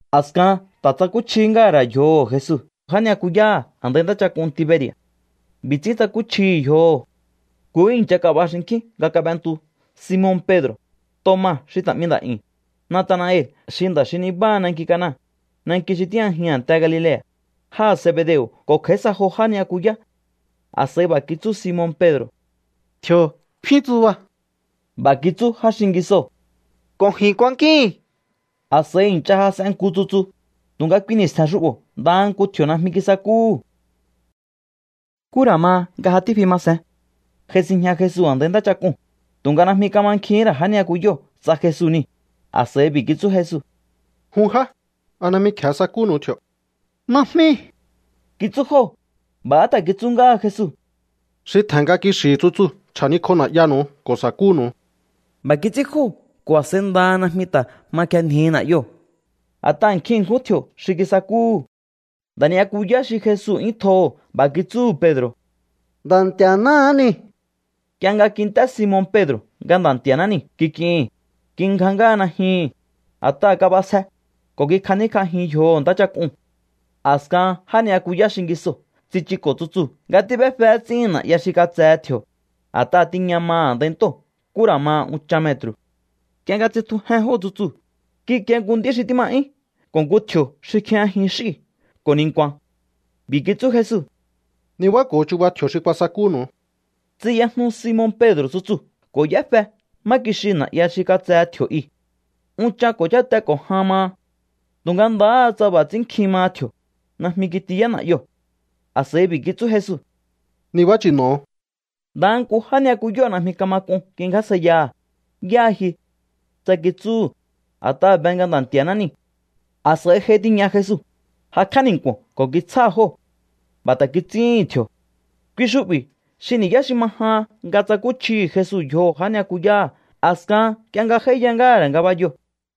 A̱skahan ta̱ tsakúchjihí ngáha̱ ra̱ yjoho̱ Jesu já ni'yakuyáha̱ a̱ndai ntáchak'un Tiberi̱a̱. B'i̱ ts'ín tsakúchjihi̱ yjoho̱. Nkuhú i̱ncha kab'a xinkjín nga kab'entu Simon Pedro̱, Toma xi ta̱ 'mi nda̱'yu̱n, Natanael xi nda̱ xi nibáha nanki Cana, nanki xi tíjñajihi̱n a̱nte Galilea̱, jáha̱ Zebedeo̱ ko̱ kj'a̱í sa jo já ni'yakuyá. A̱s'a̱i b'a̱ kitsú Simon Pedro̱: —Tji̱o̱ kfín tsuba. B'a̱ kitsú já xingisoo̱: —Ko̱ ji̱n kuankíi̱n. A̱s'a̱i i̱ncha jas'en nku tsutsu, tu̱nga kui ni̱stje̱n xu'bo̱ ndaha nku tji̱o̱ najmi kisakúhu̱. Nkú ra̱ ma nga ja tífi ma sen, j'ai sinjña Jesu a̱ndai ntáchak'uu̱n, tu̱nga najmi kamankjihín ra̱ já ni'yakuyóo̱ tsa Jesu niu̱. A̱s'a̱i b'i̱ kitsú Jesu: —Jun já, ¿a najmi kje̱e sakúnu̱u tji̱o̱? —Najmi —kitsú jóo̱. B'a̱há ta̱ kitsú ngáha Jesu: —Xi tje̱hen nga kixi̱hi̱ tsutsuu̱ chja̱nikj'o na̱'yanu̱u ko̱ sa̱kúnu̱u. B'a̱ kits'ín jóo̱ ko̱ a̱s'a̱i ndaha najmi ta̱ ma kjenjihi na̱'yoo̱, a̱t'aha̱ nkjin ṉkjún tji̱o̱ xi kisakúhu̱. Nda̱ ni'yakuyá xi Jesu 'yún tjoho̱ b'a̱ kitsúhu̱ Pedro̱: —¡Nda̱ Nti̱a̱náhá niu̱! Nk'ie nga kint'é Simon Pedro̱ nga “Nda̱ Nti̱a̱ná niu̱” kik'ihi̱n, kingja ngáha najyuhu̱n, a̱t'aha̱ kab'asje, ko̱ kikjaníkj'ajin yjoho̱ ntáchak'uu̱n. A̱skahan já ni'yakuyá xingisoo̱ tsichuko̱ tsutsuu̱ nga tíb'éfe ts'íhin na̱'ya xi katsehe tji̱o̱, a̱t'aha̱ tiña maha̱ a̱ndai ntóo̱ nkú ra̱ ma unchan metru̱. Nk'ie nga tsitjujen jóo̱ tsutsuu̱, kikie nku nd'í xi tíma 'yún ko̱ nku tji̱o̱ xi kjijñajin x'íu̱ ko̱ ni̱nku̱a̱n. B'i̱ kitsú Jesu: —Nibáko̱o chuba tji̱o̱ xi kuasakúnu̱u. Tsiyajnu Simon Pedro̱ tsutsuu̱ ko̱ y'éfe má kixiu̱ na̱'ya xi katsehe tji̱o̱ i. Unchan ko̱ cháte ko̱ jan maha. Tu̱nga ndahá tsa b'a̱ ts'ín nkjin kamaha tji̱o̱, najmi kitiyá na̱'yoo̱. A̱s'a̱i b'i̱ kitsú Jesu: —Nibá chi̱no̱o. Ndaha nku já ni'yakuyóo̱ najmi kama k'un kingjásjaiyaha̱: “¿Yáha ji?”, tsa kitsúhu̱, a̱t'aha̱ be nga Nda̱ Nti̱a̱ná niu̱. A̱s'a̱i j'ai tiña Jesu, jakj'á ni̱nku̱o̱n ko̱ kitsjáha̱ jóo̱. B'a̱ ta̱ kits'íhi̱n tji̱o̱. Kui xu'bi̱ xi ni̱yá xi ma jahan nga tsakúchjihi̱ Jesu yjoho̱ já ni'yakuyáha̱ a̱skahan nk'ie nga j'áíya ngáha̱ ra̱ ngabayoo̱.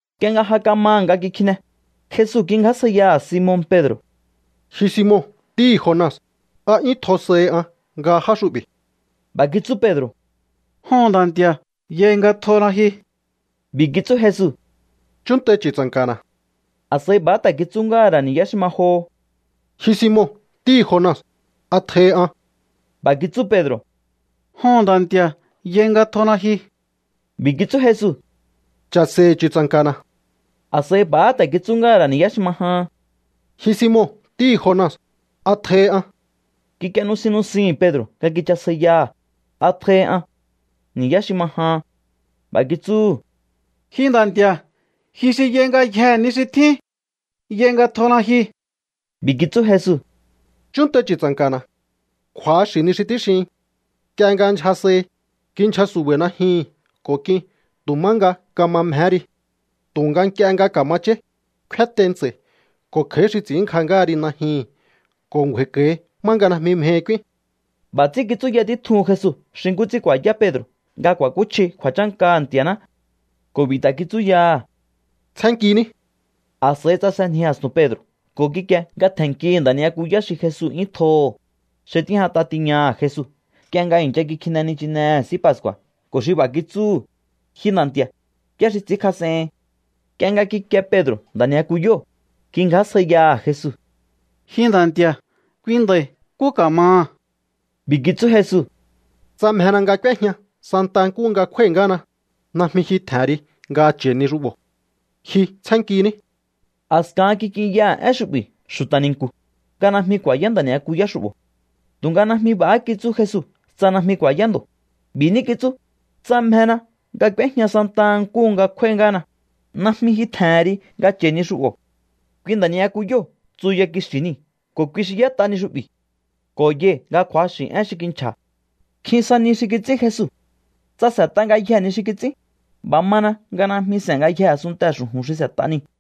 Nk'ie nga ja kamaha̱ nga kikjine, Jesu kingjásjaiyaha̱ Simon Pedro̱: —Ji Simon ntíhi̱ Jona, ¿a 'yún tjo sahi an nga já xu'bi̱? B'a̱ kitsú Pedro̱: —Joho̱n, Nda̱ Nti̱a̱, yai nga tjona ji. B'i̱ kitsú Jesu: —Chúnntai chu̱tsa̱nka̱na̱. A̱s'a̱i b'a̱há ta̱ kitsú ngáha̱ ra̱ ni̱yá xi ma joho: —Ji Simon ntíhi̱ Jona, ¿a tjohi an? B'a̱ kitsú Pedro̱: —Joho̱n, Nda̱ Nti̱a̱, yai nga tjona ji. B'i̱ kitsú Jesu: —Cha̱se̱i̱hi̱ chu̱tsa̱nka̱na̱. A̱s'a̱i b'a̱há ta̱ kitsú ngáha̱ ra̱ ni̱yá xi ma jahan: —Ji Simon ntíhi̱ Jona, ¿a tjohi an? Kik'ie nusin nusihi̱n Pedro̱ nga kichasjaiyaha̱: “¿A tjohi an?”, ni̱yá xi ma jahan. B'a̱ kitsúhu̱: —Ji Nda̱ Nti̱a̱, ji xi yai ngayjee̱ ni xi tjín. Yai nga tjona ji. B'i̱ kitsú Jesu: —Chúnntai chu̱tsa̱nka̱na̱. Kju̱axi̱ ni xi tíxihin. Nk'ie nga ndyja sahi, kindyja su̱ba̱i̱ najyihi̱n ko̱ k'in tu̱ má nga kama mjehé ri. Tu̱nga nk'ie nga ka̱ma cháí, kféntei ntsa̱i̱ ko̱ kj'a̱í xi ts'i̱ínngja ngáha ri najyihi̱n ko̱ ngju̱a̱i̱ko̱hi má nga najmi mjehi k'úín. B'a̱ ts'ín kitsúya títjuhun Jesu xi nkú ts'ín ku̱a̱yá Pedro̱ nga ku̱a̱kúchji kju̱a̱chánkaha̱ Nti̱a̱ná. Ko̱ b'i̱ ta̱ kitsú yaha̱: —Tsjénnkiní. A̱s'a̱i tsasenji a̱stu̱n Pedro̱ ko̱ kikie nga tje̱nnkihi̱ nda̱ ni'yakuyá xi Jesu 'yún tjoho̱, xi tíjñat'a tiñaha̱ Jesu nk'ie nga i̱ncha kikjine nichinehe̱ S'í Pascu̱a̱ ko̱ xi b'a̱ kitsúhu̱: “Ji Nda̱ Nti̱a̱, ¿yá xi ts'i̱ínkjas'ehin?” Nk'ie nga kikie Pedro̱ nda̱ ni'yakuyóo̱, kingjásjaiyaha̱ Jesu: —Ji Nda̱ Nti̱a̱, kui nda̱i̱, ¿nkú ka̱maha̱? B'i̱ kitsú Jesu: —Tsa mjena nga k'úéjña santa nkúhu nga kjúái̱ ngáhana, najmi ji tje̱hen ri nga cha̱i ni xu'bo̱. Ji tsjénnkiní. A̱skahan kik'inyaha̱ én xu'bi̱ xu̱ta̱ ni̱nku̱, nga najmi ku̱a̱yá nda̱ ni'yakuyá xu'bo̱. Tu̱nga najmi b'a̱há kitsú Jesu tsa najmi ku̱a̱yá ndo̱. B'i̱ ní kitsú: “Tsa mjena nga k'úéjña santa nkúhu nga kjúái̱ ngáhana, najmi ji tje̱hen ri nga cha̱i ni xu'bo̱.” Kui nda̱ ni'yakuyóo̱ tsuya kixi̱ niu̱ ko̱ kui xi y'ét'a ni xu'bi̱. Ko̱ yai̱ nga kju̱axi̱ én xi kinchja̱. Nkjin sa ni xi kits'ín Jesu. Tsa s'e̱t'a ngayjee̱ ni xi kits'ín, b'a̱ mana nga najmi s'e̱n ngayjee̱ a̱sunntee̱ xu̱ju̱n xi s'e̱t'a niu̱.